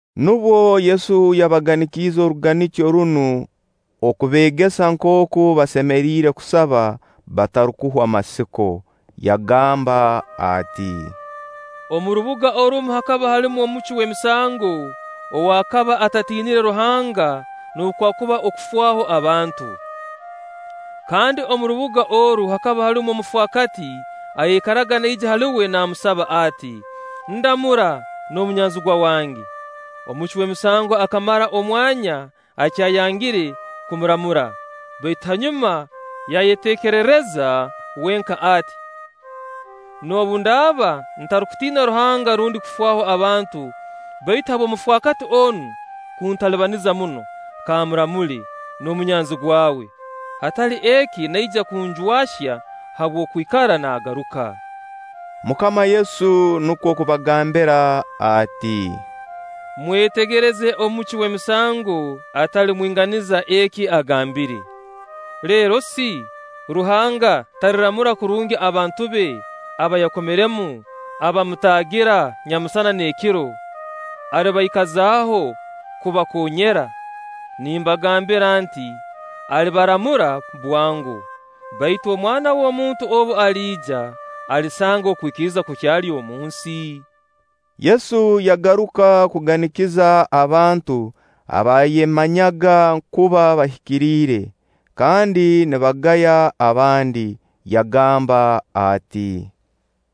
Nubwo Yesu yabaganikiize oruganikyo runu okubeegesa nkooku basemeriire kusaba batarukuhwa masiko. Yagamba ati: “Omu rubuga orumu hakaba harumu omucwi w'emisango ow'akaba atatiinire Ruhanga noobu kwakuba okufaaho abantu. Kandi omu rubuga oru hakaba harumu omufaakati ayaikaraga naija hali uwe naamusaba ati: ‘Ndamura n'omunyanzigwa wange.’ Omucwi w'emisango akamara omwanya akyayangire kumuramura; baitu hanyuma yayeteekerereza wenka ati: ‘Noobu ndaaba ntarukutiina Ruhanga rundi kufaaho abantu, baitu habw'omufaakati onu kuntalibaniza muno, kammuramule n'omunyanzigwa we. Hatali eki naija kunjwahya habw'okwikara nagaruka!’” MUKAMA Yesu nukwo kubagambira ati: “Mwetegereze omucwi w'emisango atali mwinganiza eki agambire. Lero si, Ruhanga taliramura kurungi abantu be aba yakomeremu abamutaagira nyamusana n'ekiro? Alibaikazaho kubakoonyera? Nimbagambira nti: Alibaramura bwango. Baitu Omwana w'omuntu obu aliija, alisanga okwikiriza kukyali omunsi?” Yesu yagaruka kuganikiza abantu abaayemanyaga kuba bahikiriire, kandi nibagaya abandi, yagamba ati: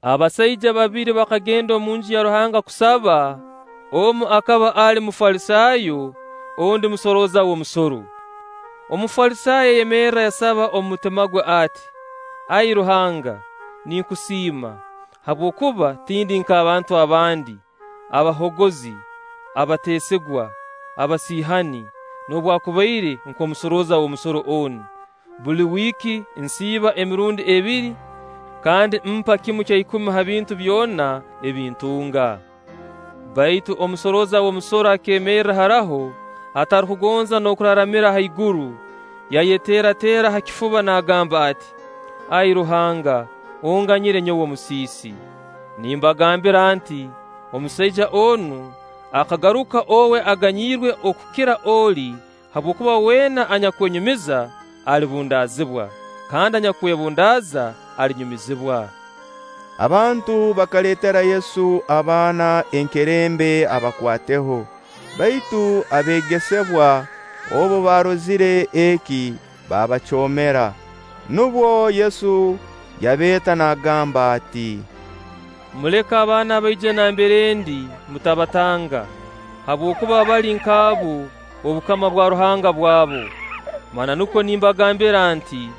“Abasaija babiri bakagenda omunju ya Ruhanga kusaba; omu akaba ali Mufalisaayo, ondi musorooza w'omusoro. Omufalisaayo yayemerra yasaba omu mutima gwe ati: ‘Ai Ruhanga, ninkusiima, habwokuba tindi nk'abantu abandi: abahoogozi, abateesigwa, abasiihani, noobwakubaire nk'omusorooza w'omusoro onu. Buli wiiki nsiiba emirundi ebiri, kandi mpa kimu kya ikumi ha bintu byona ebi ntunga.’ Baitu omusorooza w'omusoro akeemerra haraho, atarukugonza n'okuraramira haiguru, yayeteerateera ha kifuba naagamba ati: ‘Ai Ruhanga, onganyire nyowe omusiisi!’ Nimbagambira nti: Omusaija onu akagaruka owe aganyirwe okukira oli; habwokuba weena anyakwenyumiza, alibundaazibwa; kandi anyakwebundaaza, alinyumizibwa.” Abantu bakaleetera Yesu abaana enkerembe abakwateho; baitu abeegesebwa obu baarozire eki baabacoomera. Nubwo Yesu yabeeta naagamba ati: “Muleke abaana baije nambere ndi, mutabatanga; habwokuba abali nk'abo, obukama bwa Ruhanga bwabu. Mananukwo nimbagambira nti: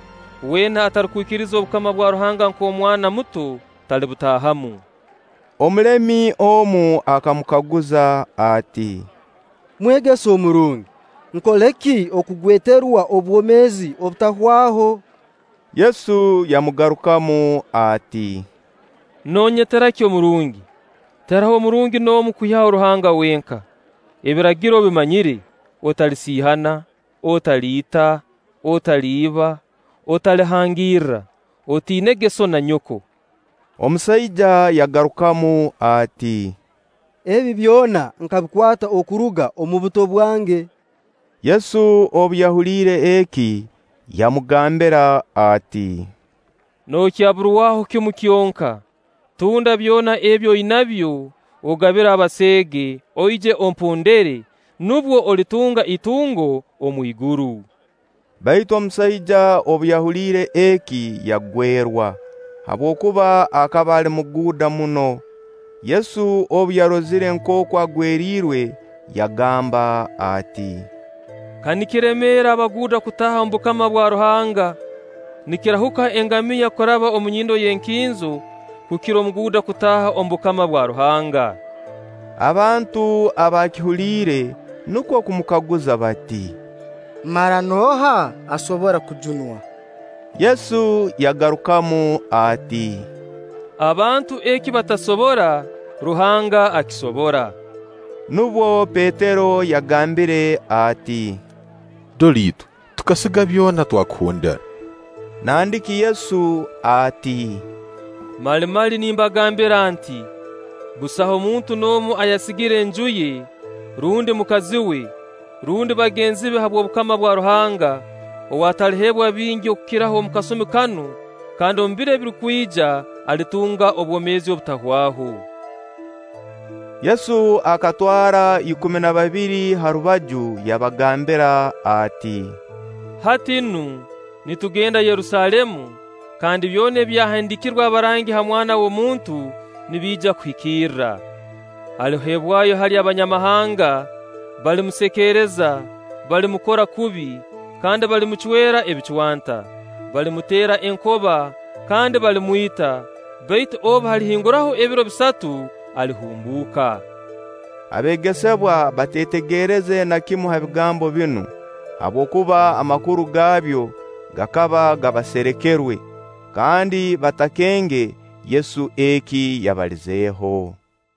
Weena atarukwikiriza obukama bwa Ruhanga nk'omwana muto, talibutaahamu.” Omulemi omu akamukaguza ati: “Mwegesa omurungi, nkole ki okugweterwa obwomeezi obutahwaho?” Yesu yamugarukamu ati: “Noonyetera ki omurungi? Tiharoho murungi n'omu kwihaho Ruhanga wenka. Ebiragiro obimanyire: ‘Otalisiihana, otaliita, otaliiba, otalihangirra, otiinege sso na nyoko.’” Omusaija yaragukamu ati: “Ebi byona nkabikwata okuruga omu buto bwange.” Yesu obu yahuliire eki, yamugambira ati: “Nookyaburwaho kimu kyonka. Tunda byona ebi oinabyo ogabire abaseege, oije ompondere; nubwo olitunga itungo omwiguru.” Baitu omusaija obu yahuliire eki yagwerwa, habwokuba akaba ali muguuda muno. Yesu obu yarozire nkooku agweriirwe, yagamba ati: “Ka nikiremeera abaguuda kutaaha omu bukama bwa Ruhanga! Nikirahuka engamiya kuraba omu nyindo y'enkinzo kukira omuguuda kutaaha omu bukama bwa Ruhanga.” Abantu abaakihuliire nukwo kumukaguza bati: “Mara nooha asobora kujunwa?” Yesu yagarukamu ati: “Abantu eki batasobora, Ruhanga akisobora.” Nubwo Petero yagambire ati: “Dora itwe, tukasiga byona twakuhondera.” Nandiki Yesu ati: “Mali mali nimbagambira nti: Busaho muntu n'omu ayasigire enju ye, rundi mukazi we, rundi bagenzi be habw'obukama bwa Ruhanga, ow'ataliheebwa bingi okukiraho omu kasumi kanu, kandi omu biro ebirukwija alitunga obwomeezi obutahwaho.” Yesu akatwara ikumi na babiri ha rubaju yabagambira ati: “Hati nu, nitugenda Yerusaalemu, kandi byona ebyahandiikirwe abarangi ha Mwana w'omuntu nibiija kuhikira. Aliheebwayo hali Abanyamahanga, balimusekeereza, balimukora kubi, kandi balimucwera ebicwanta. Balimuteera enkoba, kandi balimwita; baitu obu halihinguraho ebiro bisatu alihumbuuka.” Abeegesebwa bateetegereze na kimu ha bigambo binu, habwokuba amakuru gaabyo gakaba gabawsrekerwe, kandi batakenge Yesu eki yabalizeeho.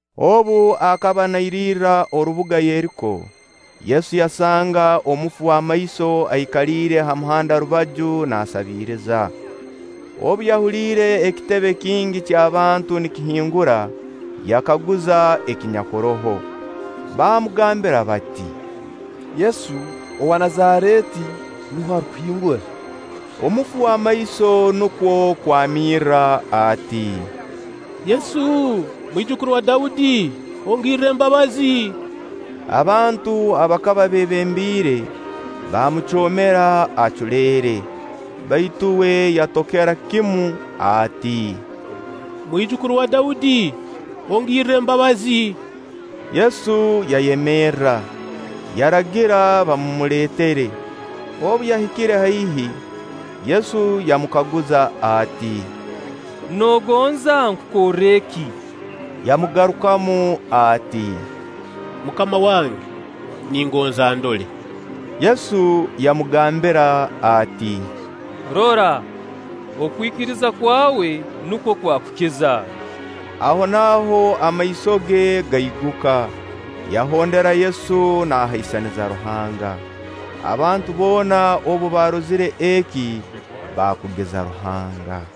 Obu akaba nairirra orubuga Yeriko, Yesu yasanga omufu w'amaiso aikaliire ha muhanda rubaju naasabiiriza. Obu yahuliire ekitebe kingi ky'abantu nikihingura, yakaguza ekinyakuroho. Baamugambira bati: “Yesu owa Nazareeti nuwe arukuhingura.” Omufu w'amaiso nukwo kwamirra ati: “Yesu, mwijukuru wa Daudi, ongirre embabazi!” Abantu abakaba beebembiire baamucoomera aculeere. Baitu uwe yatokera kimu ati: “Mwijukuru wa Daudi, ongirre embabazi!” Yesu yayemerra, yaragira bamumuleetere. Obu yahikire haihi, Yesu yamukaguza ati: “Noogonza nkukorre ki?” Yamagarukamu ati: “Mukama wange, ningonza ndole!” Yesu yamugambira ati: “Rora! Okwikiriza kwawe nukwo kwakukiza.” Ahonaaho amaiso ge gaiguka, yahondera Yesu naahaisaniza Ruhanga. Abantu boona obu baarozire eki baakugiza Ruhanga.